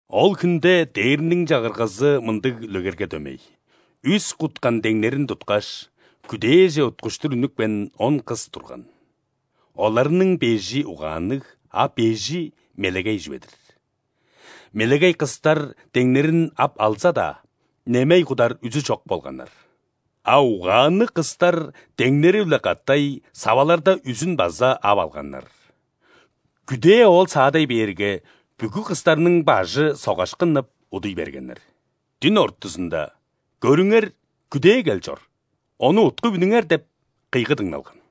«Ол хүнде Дээрниң Чагыргазы мындыг үлегерге дөмей. Үс куткан деңнерин туткаш, күдээже уткуштур үнүпкен он кыс турган. Оларның бежи угаанныг, а бежи мелегей чүве-дир. Мелегей кыстар деңнерин ап алза-даа, немей кудар үзү чок болганнар. А угаанныг кыстар деңнери-биле катай саваларда үзүн база ап алганнар. Күдээ оол саадай бээрге, бүгү кыстарның бажы согаш кыннып, удуй бергеннер. Дүн ортузунда: „Көрүңер, күдээ кел чор! Ону уткуп үнүңер!“ – деп кыйгы дыңналган.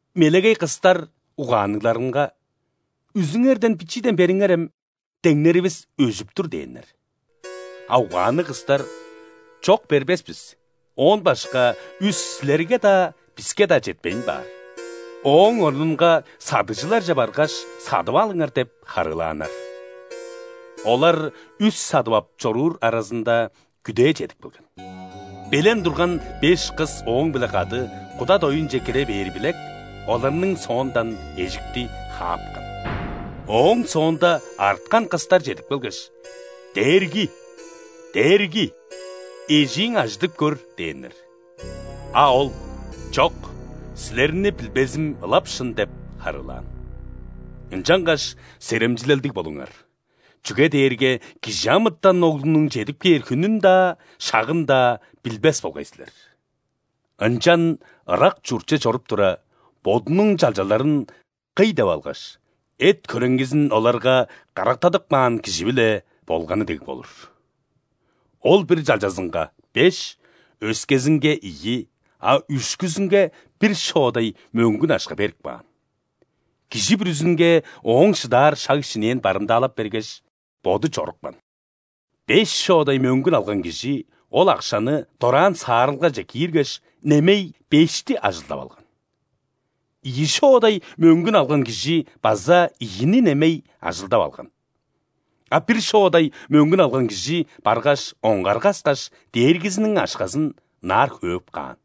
Мелегей кыстар угаанныгларынга: „Үзүңерден бичииден бериңерем, деңнеривис өжүп тур“ – дээннер. А угаанныг кыстар: „Чок, бербес бис, оон башка үс силерге-даа, биске-даа четпейн баар. Ооң орнунга садыгжыларже баргаш, садып алыңар“ – деп харыылааннар. Олар үс садып ап чоруур аразында, күдээ чедип келген. Белен турган беш кыс ооң-биле кады куда доюнче кире бээри билек, оларның соондан эжикти хаапкан. Ооң соонда арткан кыстар чедип келгеш: „Дээрги! Дээрги! Эжииң ажыдып көр!“ – дээннер. А ол: „Чок, силерни билбезим ылап шын“ – деп харыылаан. Ынчангаш серемчилелдиг болуңар, чүге дээрге ·Кижи амытан Оглунуң чедип кээр хүнүн-даа, шагын-даа билбес болгай силер». «Ынчан ырак чуртче чоруп тура, бодунуң чалчаларын кый деп алгаш, эт-хөреңгизин оларга карактадып каан кижи-биле болганы дег болур. Ол бир чалчазынга – беш, өскезинге – ийи, а үшкүзүнге – бир шоодай мөңгүн акша берип каан. Кижи бүрүзүнге ооң шыдаар шаг-шинээн барымдаалап бергеш, боду чорупкан. Беш шоодай мөңгүн алган кижи ол акшаны дораан саарылгаже кииргеш, немей бешти ажылдап алган. Ийи шоодай мөңгүн алган кижи база ийини немей ажылдап алган. А бир шоодай мөңгүн алган кижи баргаш, оңгар каскаш, дээргизиниң акшазын ынаар хөөп каан.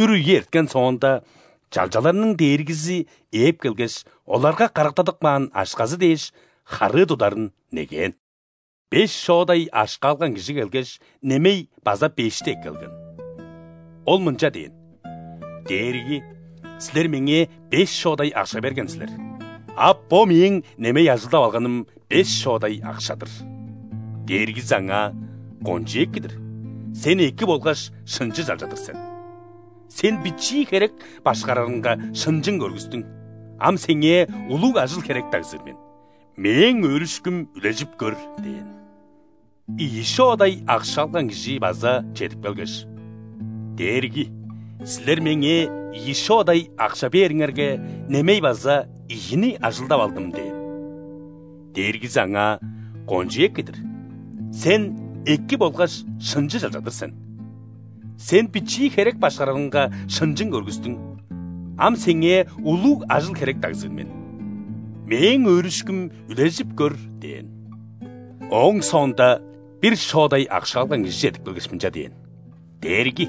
Үр үе эрткен соонда, чалчаларның дээргизи ээп келгеш, оларга карактадып каан акшазы дээш, харыы тударын негээн. Беш шоодай акша алган кижи келгеш, немей база бешти эккелген. Ол мынча дээн: „Дээрги, силер меңээ беш шоодай акша берген силер, а бо мээң немей ажылдап алганым беш шоодай акша-дыр“. Дээргизи аңаа: „Кончуг эки-дир, сен эки болгаш шынчы чалча-дыр сен! Сен бичии херек башкарарынга шынчың көргүстүң, ам сеңээ улуг ажыл-херек дагзыр мен. Мээң өөрүшкүм үлежип көр“ – дээн. Ийи шоодай акша алган кижи база чедип келгеш: „Дээрги, силер меңээ ийи шоодай акша бээриңерге, немей база ийини ажылдап алдым“ – дээн. Дээргизи аңаа: „Кончуг эки-дир, сен эки болгаш шынчы чалча-дыр сен! Сен бичии херек башкарарынга шынчың көргүстүң, ам сеңээ улуг ажыл-херек дагзыр мен. Мээң өөрүшкүм үлежип көр“ – дээн. Ооң соонда бир шоодай акша алган кижи чедип келгеш, мынча дээн: „Дээрги,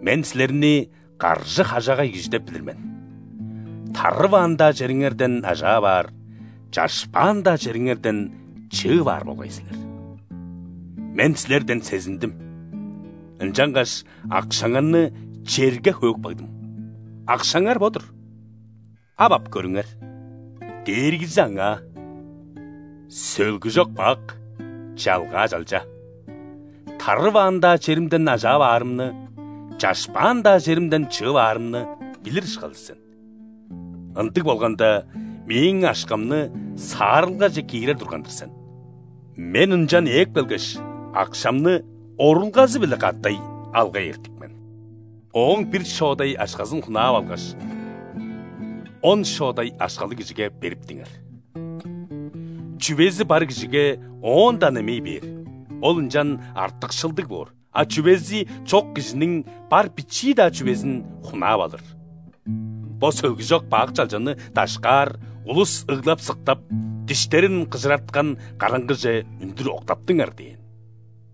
мен силерни каржы-хажагай кижи деп билир мен: тарываан-даа чериңерден ажаап аар, чашпаан-даа чериңерден чыып аар болгай силер. Мен силерден сезиндим, ынчангаш акшаңарны черге хөөп кагдым. Акшаңар бо-дур, ап ап көрүңер“. Дээргизи аңаа: „Сөлгүжок бак, чалгаа чалча! Тарываан-даа черимден ажаап аарымны, чашпаан-даа черимден чыып аарымны билир ышкажыл сен. Ындыг болганда, мээң акшамны саарылгаже киирер турган-дыр сен, мен ынчан ээп келгеш, акшамны орулгазы-биле катай алгай эртик мен. Ооң бир шоодай акшазын хунаап алгаш, он шоодай акшалыг кижиге бериптиңер. Чүвези бар кижиге оон-даа немей бээр, ол ынчан артыкшылдыг боор, а чүвези чок кижиниң бар бичии-даа чүвезин хунаап алыр. Бо сөлгүжок бак чалчаны дашкаар, улус ыглап-сыктап, диштерин кыжыраткан караңгыже үндүр октаптыңар“ – дээн».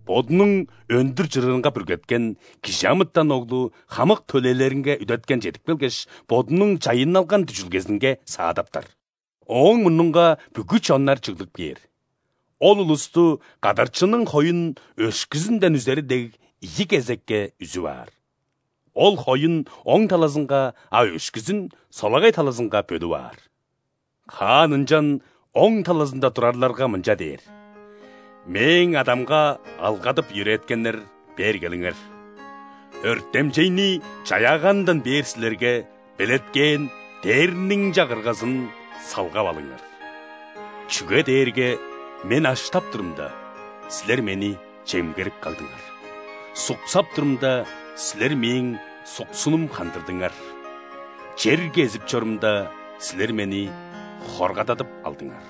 «Бодунуң өндүр чырыынга бүргеткен ·Кижи амытан Оглу хамык төлээлеринге үдеткен чедип келгеш, Бодунуң чайынналган дүжүлгезинге саадаптар. Ооң мурнунга бүгү чоннар чыглып кээр. Ол улусту, кадарчының хоюн өшкүзүнден үзери дег, ийи кезекке үзүп аар. Ол хоюн – оң талазынга, а өшкүзүн – солагай талазынга бөлүп аар. Хаан ынчан оң талазында турарларга мынча дээр: „Мээң Адамга алгадып-йөрээткеннер, бээр келиңер! Өртемчейни чаяаганындан бээр силерге белеткээн Дээрниң Чагыргазын салгап алыңар. Чүге дээрге Мен аштап турумда, силер Мени чемгерип кагдыңар; суксап турумда, силер Мээң суксунум хандырдыңар; чер кезип чорумда, силер Мени хоргададып алдыңар;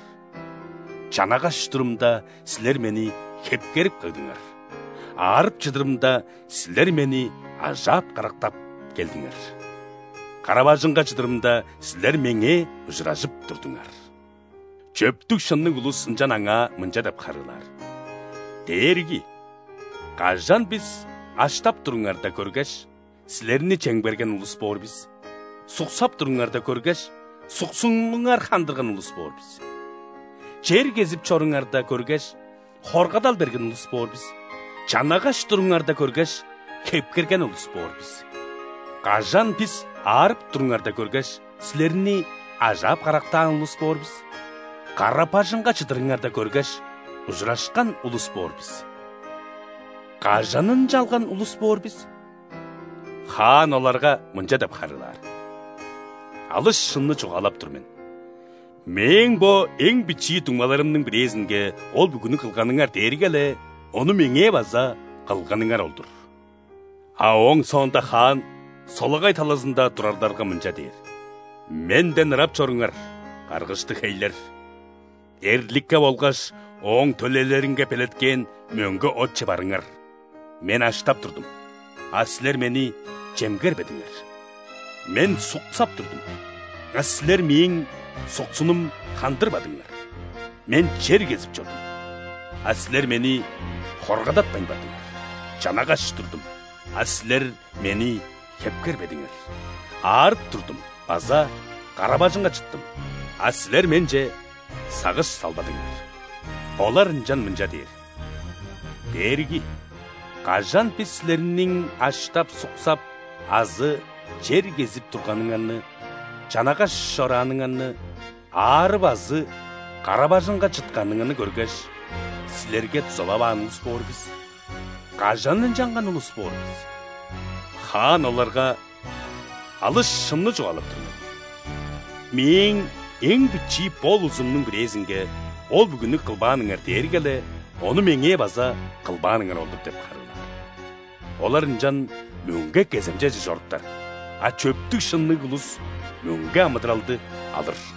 чанагаш турумда, силер Мени хепкерип кагдыңар; аарып чыдырымда, силер Мени ажаап-карактап келдиңер; кара-бажыңга чыдырымда, силер Меңээ ужуражып турдуңар“. Чөптүг-шынныг улус ынчан Аңаа мынча деп харыылаар: „Дээрги, кажан бис аштап туруңарда көргеш, Силерни чемгерген улус боор бис, суксап туруңарда көргеш, суксунуңар хандырган улус боор бис? Чер кезип чоруңарда көргеш, хоргадал берген улус боор бис; чанагаш туруңарда көргеш, хепкерген улус боор бис? Кажан бис аарып туруңарда көргеш, Силерни ажаап-карактаан улус боор бис; кара-бажыңга чыдырыңарда көргеш, ужурашкан улус боор бис? Кажан ынчалган улус боор бис?“ Хаан оларга мынча деп харыылаар: „Алыс шынны чугаалап тур мен: Мээң бо эң бичии дуңмаларымның бирээзинге ол бүгүнү кылганыңар дээрге-ле ону Меңээ база кылганыңар ол-дур“. А ооң соонда Хаан солагай талазында турарларга мынча дээр: „Менден ырап чоруңар, каргыштыг хейлер! Эрликке болгаш ооң төлээлеринге белеткээн мөңге отче барыңар. Мен аштап турдум, а силер Мени чемгербедиңер; Мен суксап турдум, а силер Мээң суксунум хандырбадыңар; Мен чер кезип чордум, а силер Мени хоргадатпайн бардыңар; чанагаш турдум, а силер Мени хепкербедиңер, аарып турдум база кара-бажыңга чыттым, а силер Менче сагыш салбадыңар“. Олар ынчан мынча дээр: „Дээрги, кажан бис Силерниң аштап, суксап азы чер кезип турганыңарны, чанагаш чорааныңарны, аарып азы кара-бажыңга чытканыңарны көргеш, Силерге дузалаваан улус боор бис? Кажан ынчалган улус боор бис?“ Хаан оларга: „Алыс шынны чугаалап тур мен: Мээң эң бичии бо улузумнуң бирээзинге ол бүгүнү кылбааныңар дээрге-ле ону Меңээ база кылбааныңар ол-дур“ – деп харыылаар. Олар ынчан мөңге кеземчеже чоруптар, а чөптүг-шынныг улус мөңге амыдыралды алыр».